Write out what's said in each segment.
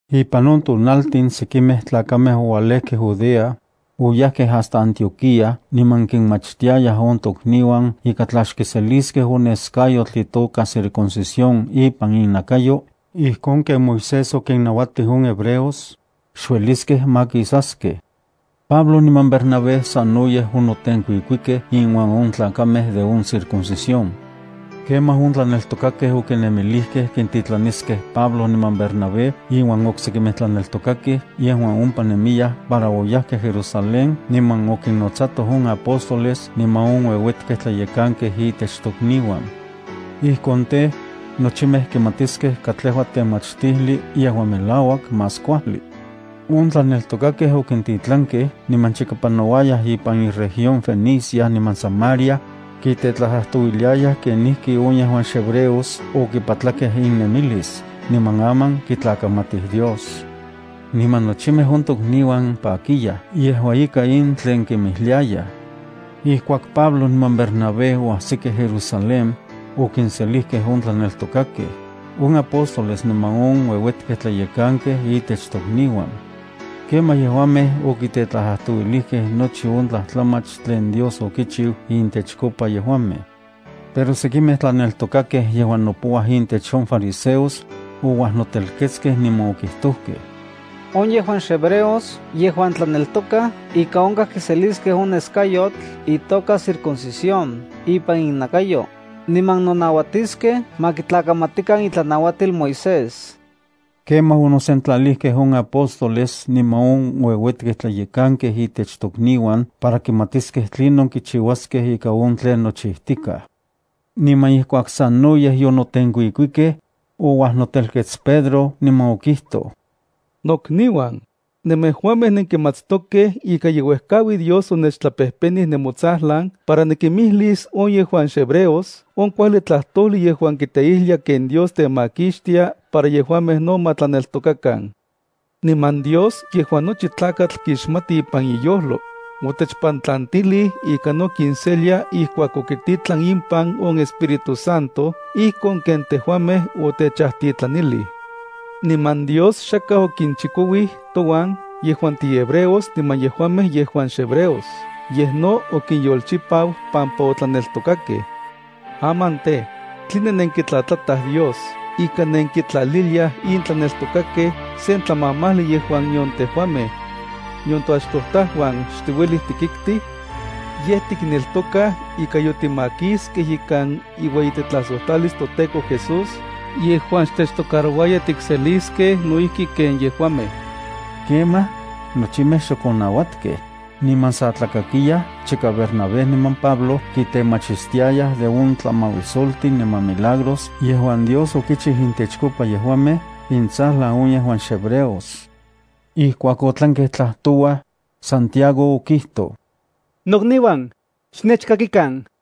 Ipan on tonaltin sekimej tlakamej oualejkej Judea, oyajkej hasta Antioquía niman kinmachtiayaj on tokniuan ika tla xkiseliskej on neskayotl itoka circuncisión ipan innakayo ijkon ken Moisés okinnauatij on hebreos, xueliskej makisaskej. Pablo niman Bernabé sanoyej onotenkuikuikej inuan on tlakamej de on circuncisión. Kemaj on tlaneltokakej okinemilijkej kintitlaniskej Pablo niman Bernabé inuan oksekimej tlaneltokakej yejuan ompa nemiyaj para oyajkej Jerusalén niman okinnotsatoj on apóstoles niman on ueuetkej tlayekankej itech tokniuan. Ijkon tej, nochimej kimatiskej katlejua temachtijli yejuan melauak más kuajli. On tlaneltokakej okintitlankej niman chika panouayaj ipan inregión Fenicia niman Samaria, kitetlajtlajtouiliayaj kenijki on yejuan xhebreos okipatlakej innemilis niman aman kitlakamatij Dios. Niman nochimej on tokniuan pakiyaj yejua ika in tlen kinmijliayaj. Ijkuak Pablo niman Bernabé oajsikej Jerusalén, okinselijkej on tlaneltokakej, on apóstoles niman on uejuetekej tlayekankej itech tokniuan. Kemaj yejuamej okitetlajtlajtouilijkej nochi on tlajtlamach tlen Dios okichiu intechkopa yejuamej. Pero sekimej tlaneltokakej yejuan nopouaj intech on fariseos, ouajnotelketskej niman okijtojkej: —On yejuan xhebreos yejuan tlaneltokaj ika onkaj kiseliskej on neskayotl itoka circuncisión ipan innakayo, niman nonauatiskej ma kitlakamatikan itlanauatil Moisés. Kemaj onosentlalijkej on apóstoles niman on ueuetkej tlayekankej itech tokniuan para kimatiskej tlinon kichiuaskej ika on tlen nochijtikaj. Niman ijkuak sanoyej yonotenkuikuikej, ouajnotelkets Pedro niman okijtoj: —Nokniuan, nemejuamej nenkimatstokej ika ye uejkaui Dios onechtlapejpenij nemotsajlan para nikimijlis on yejuan xhebreos on kuajli tlajtojli yejuan kiteijlia ken Dios temakixtia para yejuamej no ma tlaneltokakan. Niman Dios yejuan nochi tlakatl kixmati ipan iyojlo, otechpantlantilij ika no kinselia ijkuak okititlan impan on iEspíritu Santo ijkon ken tejuamej otechajtitlanilij. Niman Dios xakaj okichikouij touan yejuan tihebreos niman yejuamej yejuan xhebreos, yej no okinyolchipau pampa otlaneltokakej. Aman tej, ¿tline nenkitlatlataj Dios ika nenkintlaliliaj in tlaneltokakej sen tlamamajli yejuan nion tejuamej, nion toachtojtajuan xtiuelij tikiktij? Yej tikneltokaj ika yotimakiskej ikan iueyitetlajsojtlalis toTEKO Jesús yejuan xtechtocarouaya tikseliskej no ijki ken yejuamej. Kemaj nochimej xok onauatkej, niman san tlakakiyaj chika Bernabé niman Pablo kitemachistiayaj de on tlamauisoltin niman milagros yejuan Dios okichiu intechkopa yejuamej intsajlan on yejuan xhebreos. Ijkuak otlankej tlajtouaj, Santiago okijtoj: —Nokniuan, xnechkakikan: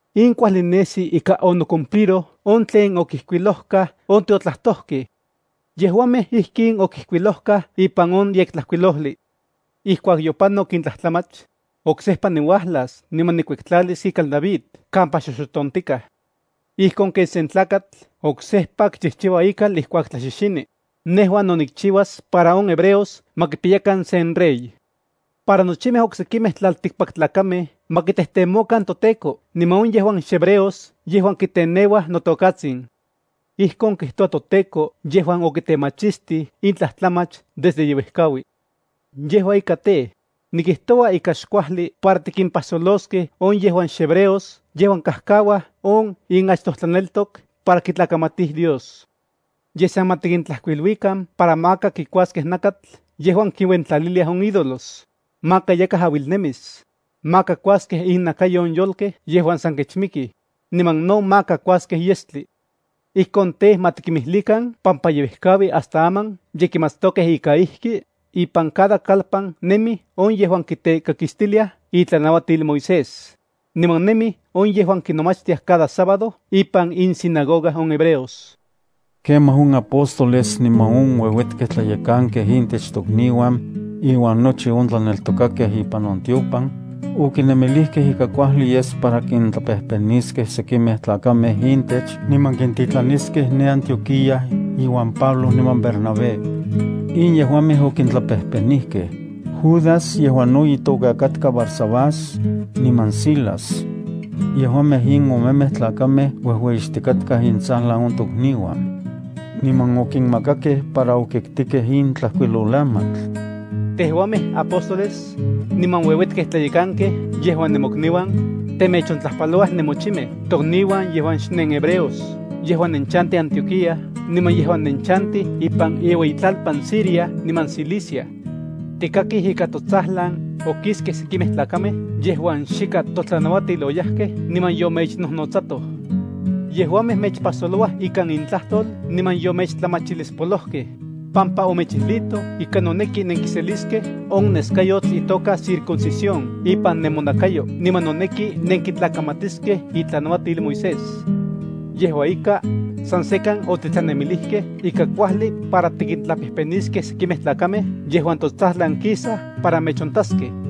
In kuajli nesi ika onocumpliroj on tlen okijkuilojkaj on tiotlajtojkej. Yejuamej ijkin okijkuilojkaj ipan on Yektlajkuilojli: “Ijkuak yopanok in tlajtlamach, oksejpa niuajlas niman nikuektlalis ikal David kampa xoxotontikaj. Ijkon ken sen tlakatl oksejpa kichijchiua ikal ijkuak tlaxixini, nejua no nikchiuas para on hebreos ma kipiyakan sen rey, para nochimej oksekimej tlaltikpaktlakamej ma kitejtemokan toTEKO niman on yejuan xhebreos yejuan kiteneuaj notokatsin. Ijkon kijtoua toTEKO yejuan okitemachistij in tlajtlamach desde yeuejkaui.” ’Yejua ika tej, nikijtoua ika xkuajli para tikimpajsoloskej on yejuan xhebreos yejuan kajkauaj on inachtojtlaneltok para kitlakamatij Dios. Yej, san ma tikintlajkuiluikan para maka kikuaskej nakatl yejuan kiuentlaliliaj on idolos, maka yakaj auilnemis, maka kuaskej innakayo on yolkej yejuan san kechmikij, niman no maka kuaskej yestli. Ijkon tej, ma tikinmijlikan pampa ye uejkaui hasta aman ye tikmatstokej ika ijki ipan cada kalpan nemij on yejuan kitekakistiliaj itlanauatil Moisés, niman nemij on yejuan kinomachtiaj cada sábado ipan insinagoga on hebreos. Kemaj on apóstoles niman on ueuetkej tlayekankej intech tokniuan, iuan nochi on tlaneltokakej ipan on tiopan, okinemilijkej ika kuajli yes para kintlapejpeniskej sekimej tlakamej intech niman kintitlaniskej ne Antioquía iuan Pablo niman Bernabé. In yejuamej okintlapejpenijkej: Judas, yejuan no itoka katka Barsabás, niman Silas. Yejuamej in omemej tlakamej ueyixtikatkaj intsajlan on tokniuan. Niman okinmakakej para okiktikej in tlajkuilolamatl: Tejuamej apóstoles, niman ueuetkej tlayekankej yejuan nemokniuan, temechontlajpalouaj nemochimej tokniuan yejuan xnenhebreos yejuan nenchantij Antioquía, niman yejuan nenchantij ipan iueyitlalpan Siria niman Cilicia. Tikakij ika totsajlan okiskej sekimej tlakamej yejuan xikan totlanauatil oyajkej niman yomechnojnotsatoj. Yejuamej mechpajsolouaj ikan intlajtol niman yomechtlamachilispolojkej, pampa omechijlijtoj ika noneki nenkiseliskej on neskayotl itoka circuncisión ipan nemonakayo niman noneki nenkitlakamatiskej itlanauatil Moisés. Yejua ika, san sekan otitlanemilijkej ika kuajli para tikintlapejpeniskej sekimej tlakamej yejuan totsajlan kisaj para mechontaskej.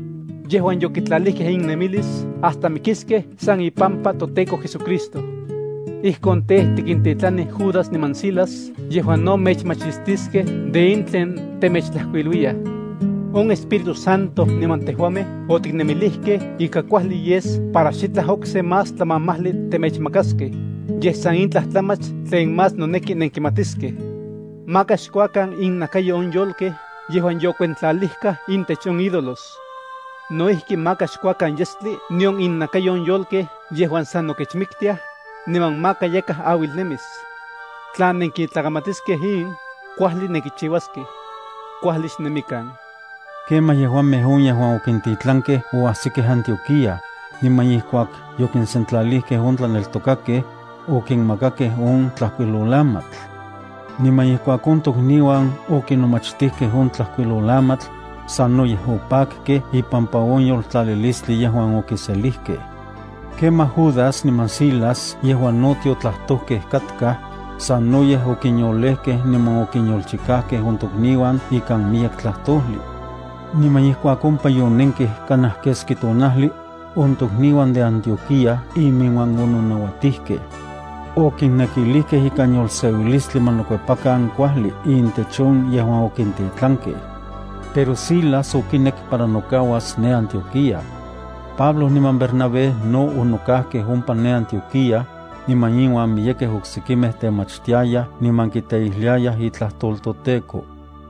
yejuan yokitlalijkej innemilis hasta mikiskej san ipampa toTEKO JesuCristo. Ijkon tej, tikintitlanij Judas niman Silas yejuan no mechmachistiskej de in tlen temechtlajkuiluiyaj. On Espíritu Santo niman tejuamej otiknemilijkej ika kuajli yes para xitlaj okse más tlamamajli temechmakaskej, yej san in tlajtlamach tlen más noneki nenkimatiskej: maka xkuakan innakayo on yolkej yejuan yokuentlalijkaj intech on ídolos; no ijki maka xkuakan yestli nion innakayo on yolkej yejuan san nokechmiktiaj, niman maka yakaj auilnemis. Tla nenkitlakamatiskej in, kuajli nenkichiuaskej. Kuajli xnemikan. Kemaj yejuamej on yejuan okintitlankej oajsikej Antioquía, niman ijkuak yokinsentlalijkej on tlaneltokakej, okinmakakej on tlajkuilolamatl. Niman ijkuak on tokniuan okinomachtijkej on tlajkuilolamatl, sanoyej opakkej ipampa on yoltlalilistli yejuan okiselijkej. Kemaj Judas niman Silas yejuan no tiotlajtojkej katkaj, sanoyej okinyolejkej niman okinyolchikajkej on tokniuan ikan miyek tlajtojli. Niman ijkuak ompa yonenkej kanaj keski tonajli, on tokniuan de Antioquía iminuan ononauatijkej. Okinnekilijkej ikan yolseuilistli ma nokuepakan kuajli intech on yejuan okintitlankej. Pero Silas okinek para nokauas ne Antioquía. Pablo niman Bernabé no onokajkej ompa ne Antioquía, niman inuan miyekej oksekimej temachtiayaj niman kiteijliayaj itlajtol toTEKO.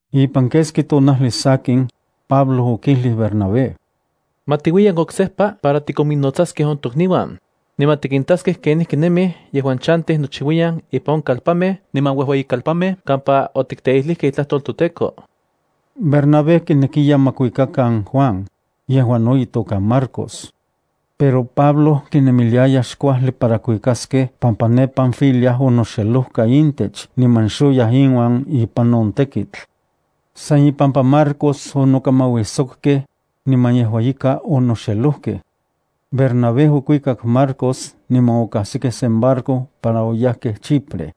Ipan keski tonajli sakin, Pablo okijlij Bernabé: —Ma tiuiyan oksejpa para tikominnotsaskej on tokniuan, niman tikintaskej kenijki nemij yejuan chantij nochiuiyan ipan on kalpanmej niman ueyikalpanmej kampa otikteijlijkej itlajtol toTEKO. Bernabé kinekiya ma kuikakan Juan, yejuan no itoka Marcos. Pero Pablo kinemiliaya xkuajli para kuikaskej pampa ne Panfilia onoxelojka intech niman xoyaj inuan ipan on tekitl. San ipampa Marcos onokamauijsokkej, niman yejua ika onoxelojkej. Bernabé okuikak Marcos niman okajsikej sen barco para oyajkej Chipre.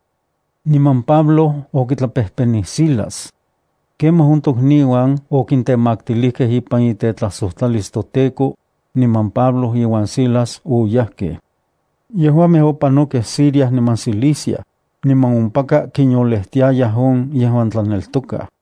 Niman Pablo okitlapejpenij Silas. Kemaj on tokniuan okintemaktilijkej ipan itetlajsojtlalis toTEKO, niman Pablo iuan Silas oyajkej. Yejuamej opanokej Siria niman Cilicia, niman ompaka kinyolejtiayaj on yejuan tlaneltokaj.